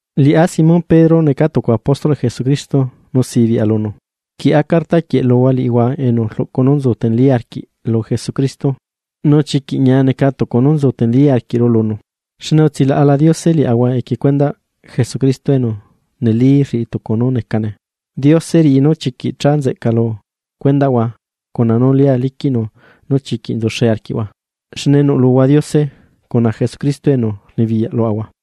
Liꞌá Simón Pedro, neca tucu apóstolꞌ Jesucristo nu sibiꞌa lunu. Rquieꞌa carta quieꞌ luhua liꞌihua enu rluꞌcu nú nzu teneli arquiꞌ lu Jesucristo nú chiquiꞌ ñia neca tucu nú nzu teneli arquiꞌru lunu. Xne utsilaꞌla Diose liaꞌahua equie cuendaꞌ Jesucristo enu neli rriꞌi tucu nú necane. Diose riꞌi nú chiquiꞌ cha nzeꞌca lu cuendaꞌhua cuna nú lia liquiꞌnu nú chiquiꞌ nzuxe arquiꞌhua, xne nuꞌluhua Diose cuna Jesucristo enu rnibiyaꞌ luaꞌahua.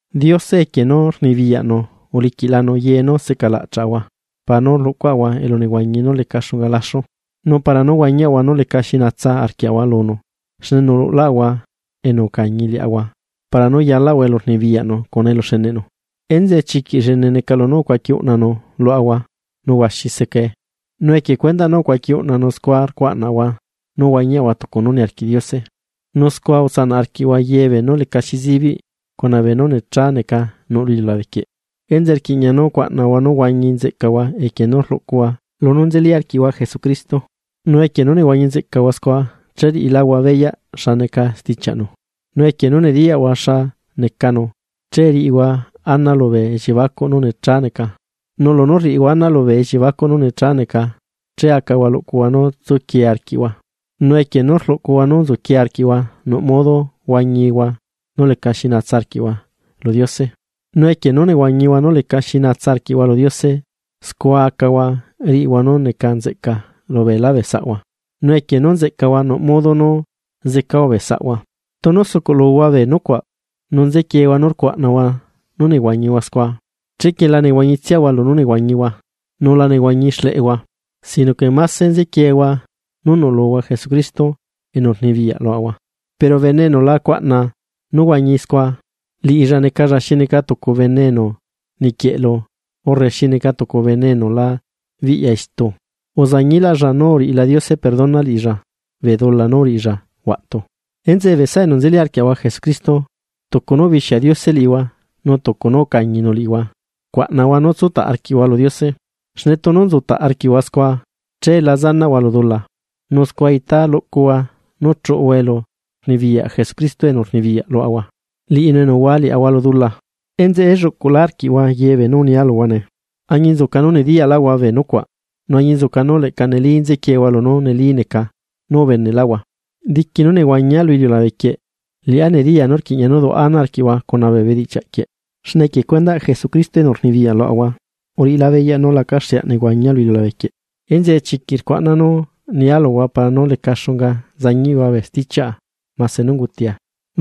Diose equie nú rluꞌcunu poder uliquiꞌlanu ye nú seꞌca laꞌchaꞌahua para nú rluꞌcuaꞌahua elunehuañi nú leca xunga laxu, nu para nú huañiaꞌahua nú lecaxi natsa arquiaꞌahua lunu. Xne nuꞌlulaꞌahua enu ucañi liaꞌahua para nú yalaꞌahua elu rnibiyaꞌnu cuna eluxeneꞌnu. Enzeꞌe chiquiꞌ llene neca lunú ucuaqui uꞌnanu luaꞌahua nu huaxi secae, nu equie cuendaꞌ nú ucuaquiꞌ uꞌnanu scua rcuaꞌnahua nú huañihua tucu nu niarquiꞌ Diose, nu scua utsanaꞌ arquiꞌhua ye beenú lecaxi zibiꞌ cuna beenú necha neca nuꞌ lu iliulabe quieꞌ. Enzeꞌe rquiꞌña nú cuaꞌnahua nú huañi nzeꞌcahua equie nú rluꞌcuhua lunú nzeli arquiꞌhua Jesucristo, nu equie nú nehuañi nzeꞌcahua scua che riꞌiláhua beyaꞌ xa neca stichiaꞌnu; nu equie nu nediyaꞌhua xa necanu, che rriꞌihua ana lubee elliebacuꞌhua nú necha neca, nu lunú rriꞌihua ana lubee elliebacuꞌhua nu necha neca, ché acahua luꞌcuhua nú tsuquie arquiꞌhua, nu equie nú rluꞌcuhua nú nzuquie arquiꞌhua nuꞌ modo huañihua nú lecaxi naa arquiꞌhua lu Diose; nu equie nú nehuañihua nú lecaxi naa arquiꞌhua lu Diose, scua acahua riꞌihua nú neca nzeꞌca lu beelá bee saꞌhua, nu equie nu nzeꞌcahua nuꞌ modo nú zecahua bee saꞌhua. Tunu sucuꞌluhua bee nucuaꞌ, nu nzequiehua nu rcuaꞌnahua nu nehuañihua scua, chequie la nehuañitsiahua lunú nehuañihua, nu la nehuañi xleꞌehua, sino que máse nzequiehua nú nuꞌluhua Jesucristo enu rnibiyaꞌ luaꞌahua. Pero bene enu la cuaꞌna nú huañi scua, liꞌilla necalla xi neca tucu bene enu niquieꞌlu urre xi neca tucu enu la biꞌya istu. Uzañilaꞌlla nú uriꞌila Diose perdona liꞌilla bee dula nú uriꞌilla huaꞌtu. Enzeꞌe bee saꞌa enu nzeli arquiaꞌahua Jesucristo, tucu nu ubixia Diose liꞌihua nu tucu nú ucañinu liꞌihua, cuaꞌnahua nú tsutaꞌ arquiꞌhua lu Diose, xne tunu nzutaꞌ arquiꞌhua scua, che la zanaꞌhua lu dula. Nu scua itá luꞌcuhua nú chuꞌuhua elurnibiyaꞌ Jesucristo enu rnibiyaꞌ luaꞌahua, liꞌinu enu uhua liaꞌahua lu dula. Enzeꞌe la tsanaa nú relluꞌcuꞌ arquia liꞌihua ye bee nu unia luhua nee, añinzuca nú nediyalaꞌhua bee nucuaꞌ nu añinzuca nu leꞌca neli nzequiehua lunú neli neca nú ubeneꞌlaꞌhua. Diqui nú nehuañia lu iliulabe quieꞌ, liꞌá nediya nú rquiꞌña nú duaꞌa ana arquiꞌhua cuna bee bedichiaꞌ quieꞌ. Xne equie cuendaꞌ Jesucristo enu rnibiyaꞌ luaꞌahua uriꞌilá beyaꞌ nú lacaxeaꞌ nehuañia lu iliulabe quieꞌ. Enzeꞌe chiquiꞌ rcuaꞌna nu nia luhua para nú leca xunga zañiꞌhua bee stichiaꞌa, mase nú ungutia.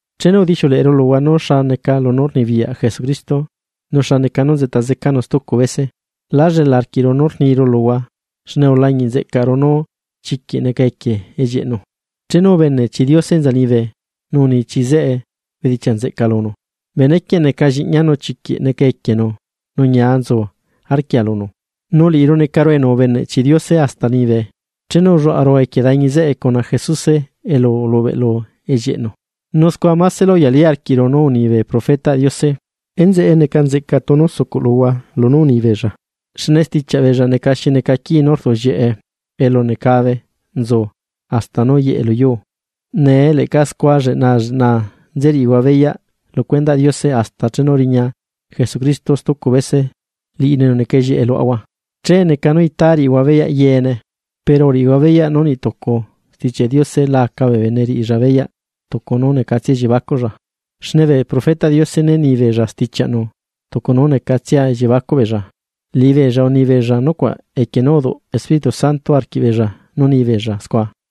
Chenu udixiuleꞌeru luhua nu xa neca lunú rnibiyaꞌ Jesucristo, nu xa neca nu nzeꞌta zecanu stucu bese, lá llela arquiꞌru nú rniru luhua xne ulañiꞌ nzeꞌcaꞌru nú chiquiꞌ neca equie ellieꞌnu. Chenu ubene chi Diose enza liñibe, nu uni chi zeꞌe bedichiaꞌ nzeꞌca lunu: “Benequieꞌ neca lliꞌñia nu chiquiꞌ neca equienu nu ñia nzu arquia lunu.” Nu liꞌiru necaru enu ubeneꞌ chi Diose hasta liñibe, chenu ulluaꞌaru equie dañi zeꞌe cuna Jesuse elu ulubeꞌlu ellieꞌnu. Nu scua másela uyali arquiꞌru nú uni bee profetaꞌ Diose. Enzeꞌe, neca nzeꞌca tunu sucuꞌluhua lunú uni beella, xne stichiaꞌ beella neca xi neca quii nú rduꞌllieꞌe elu necabe nzu hasta nú yeꞌe luyuu. Nee leꞌca scua lleꞌnaa, lleꞌnaa nze riꞌihua beyaꞌ lu cuendaꞌ Diose hasta chenu riña Jesucristo stucu bese liꞌinu enu neca ellieꞌe luaꞌahua, che itá riꞌihua beyaꞌ yeene. Pero uriꞌihua beyaꞌ nú niꞌ tucu Stichiaꞌ Diose la aca bee bene riꞌilla beyaꞌ tucu nú necatsia elliebacuꞌlla, xne bee profetaꞌ Diose né ni beella stichiaꞌnu tucu nú necatsia elliebacuꞌ beella, liꞌibeella uni beella nucuaꞌ equie nú uduꞌ Espíritu Santo arquiꞌbeella nu ni beella scua.